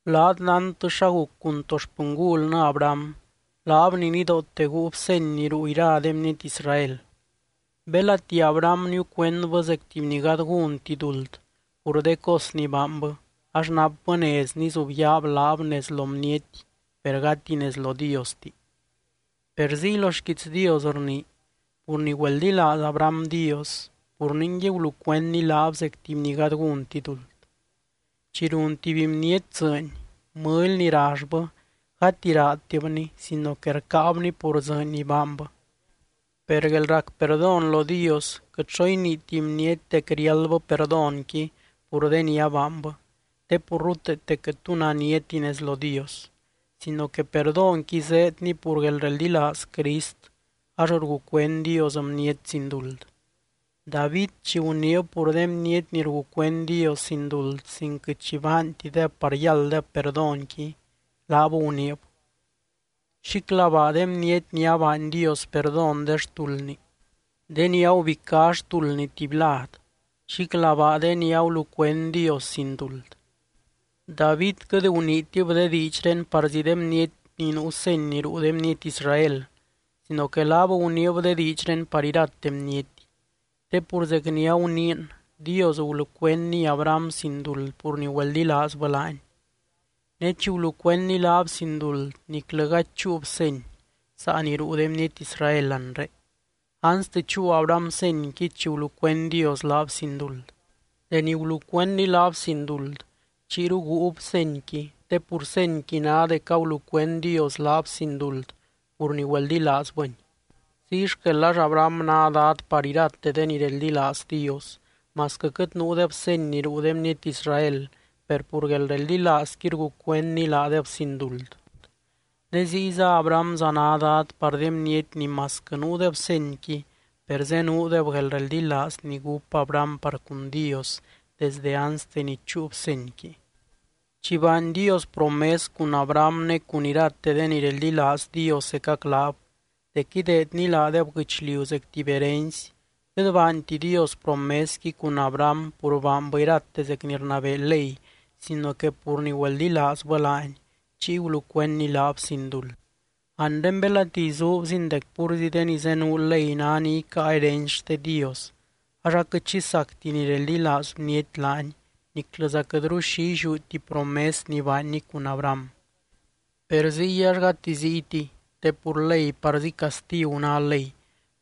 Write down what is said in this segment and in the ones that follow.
Laat nántɨ xa guc cun to xpɨngulnɨ Abraham, laab ni nidoote guub seny ni ruu ira de bniety Israel. Belati Abraham niucuendbɨ zec tuby ni gady gúnti duld pur de cos ni baanbɨ ax napbɨ nez nizubyaab laab nez lo bniety per gati nez lo Diosti per ziy lo xquiits Dios rnii: “Pur ni güeldilaaz Abraham Dios, pur ningui gulucuendny laab zec tuby ni gady gúnti duld.” Chi run tuby bniety dzɨɨny, mɨly ni rallbɨ gati raadtibni sino que rcáabni pur dzɨɨny ni baanbɨ. Per guelrac perdón lo Dios quɨt xo iniiti bniety dec riáldbɨ perdónqui pur de ni abaanbɨ, te pur ruteete quɨt tu naniati nez lo Dios. Sino que perdónqui zéedni pur guelreldilaaz Crist ax rgucuend Dios bniety sin duld. David chi guniib pur de bniety ni rgucuend Dios sin duld sin quɨt xi baantideb par yálddeb perdónqui, laab guniib: Xíclabaa de bniety ni abaany Dios perdón de xtuldni, de ni agubicá xtuldni tuby lad. Xíclabaa de ni agulucuend Dios sin duld. David quɨt guniitib de diidxré parzí de bniety ni nuu seny ni ruu de bniety Israel, sino que laab guniib de diidxré par irate bniety. Te pur zec ni aguniin, Dios gulucuendny Abraham sin duld pur ni güeldilaazbɨ laany. Ne chi gulucuendny laab sin duld niclɨ gady chúub seny, saa ni ruu de bniety Israel anre, anste chúu Abraham senyqui chi gulucuend Dios laab sin duld. Deni gulucuendny laab sin duld, chiyru guub senyqui te pur senyqui ná dec agulucuend Dios laab sin duld pur ni güeldilaazbɨny. Ziy xquel ax Abraham ná dad par irate de ni reldilaaz Dios, masquɨ quɨt nuudeb seny ni ruu de bniety Israel, per pur guelreldilaazqui rgucuendny laadeb sin duld. Ne ziyza Abrahamza ná dad par de bniety ni masquɨ nuudeb senyqui, per zenuudeb guelreldilaaz ni gúp Abraham par cun Dios desde anste ni chúub senyqui. Chi baany Dios promes cun Abraham ne cun irate de ni reldilaaz Dios zecac laab dec ideedny laadeb guɨchliu zec tuby herency, quɨt baanti Dios promesqui cun Abraham pur baanbɨ irate zec ni rnabee ley sino que pur ni güeldilaazbɨ laany, chiy gulucuendny laab sin duld. Anre belati izuubzin dec púrzi de ni zenuu ley ná ni icáa herency xte Dios ax aquɨt xi sacti ni reldilaaz bniety laany niclɨza quɨtru xi illiúti promes ni baanny cun Abraham. Per ziy ax gati ziytiy, te pur ley parzí castigu ná ley,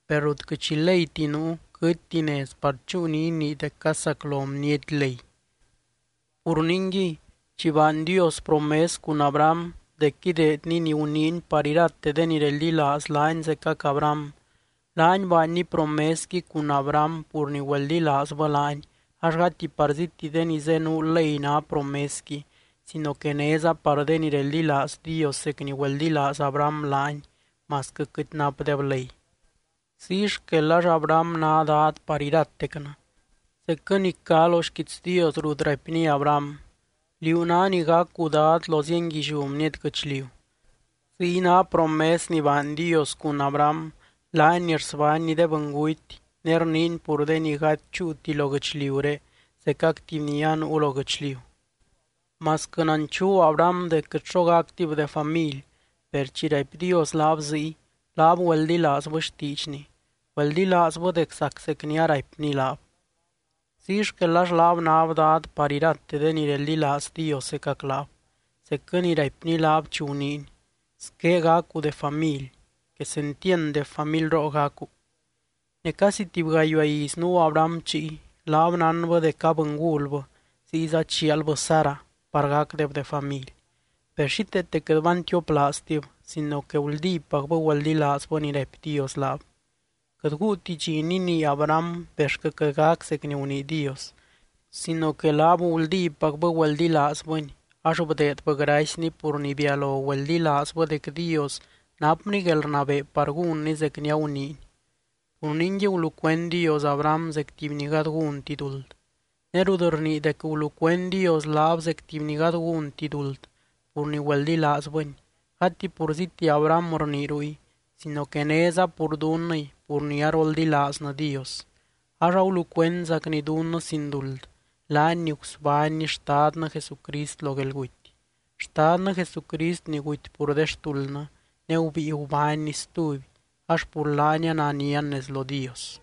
per rut quɨt xi leyti nuu, quɨtti nez par chúu ni inii dec casaclo bniety ley. Pur ningui, chi baany Dios promes cun Abraham dec ideedny ni guniiny par irate de ni reldilaaz laany zecac Abraham, laany baanny promesqui cun Abraham pur ni güeldilaazbɨ laany ax gati parzíti de ni zenuu ley ná promesqui sino que néza par de ni reldilaaz Dios zec ni güeldilaaz Abraham laany masquɨ quɨt napdeb ley. Ziy xquel ax Abraham ná dad par iratecnɨ. (Zecquɨ ni cá lo xquiits Dios rut raipny Abraham: “Liú ná ni gacu dad lo zienguilliú bniety guɨchliu.”) Ziy ná promes ni baany Dios cun Abraham, laany ni rsbánny de bɨnguty ne rniiny pur de ni gady chúuti lo guɨchliuré zecac tuby ni anuu lo guɨchliu. Masquɨ nanchuu Abraham dec quɨt xo gactib de family, per chi raipy Dios laab ziy, laab güeldilaazbɨ xtiidxny, güeldilaazbɨ dec zac zec ni araipny laab. Ziy xquel ax laab náb dad par irate de ni reldilaaz Dios zecac laab, zecquɨ ni raipny laab chi guniiny: “Squé gacu de family, quesentiand de familroo gacu.” Ne casi tuby gayuaa iz nuu Abraham chiy, laab nánbɨ dec abɨngulbɨ ziyza chialbɨ Sara par gacdeb de family, per xíteete quɨt bantioplaaztib sino que guldípacbɨ güeldilaazbɨ ni raipy Dios laab. Quɨt guuti dxi ninii Abraham bexquɨ quɨt gac zec ni gunii Dios. Sino que laab guldípacbɨ güeldilaazbɨny, ax bdeedbɨ gracyny pur ni bialo güeldilaazbɨ dec Dios napny guelrnabee par gúnny zec ni aguniiny. Pur ningui gulucuend Dios Abraham zec tuby ni gady gúnti duld. Ne rut rnii dec gulucuend Dios laab zec tuby ni gady gúnti duld pur ni güeldilaazbɨny, gati purzíti Abraham rnii ruy sino que néza pur dunnɨy pur ni aroldilaaznɨ Dios. Ax agulucuendzacny dunnɨ sin duld, laany ni gusbánny Xtadnɨ Jesucrist lo guelguty, Xtadnɨ Jesucrist ni guty pur de xtuldnɨ, ne gubíi gubánny stuby ax pur laany ananian nez lo Dios.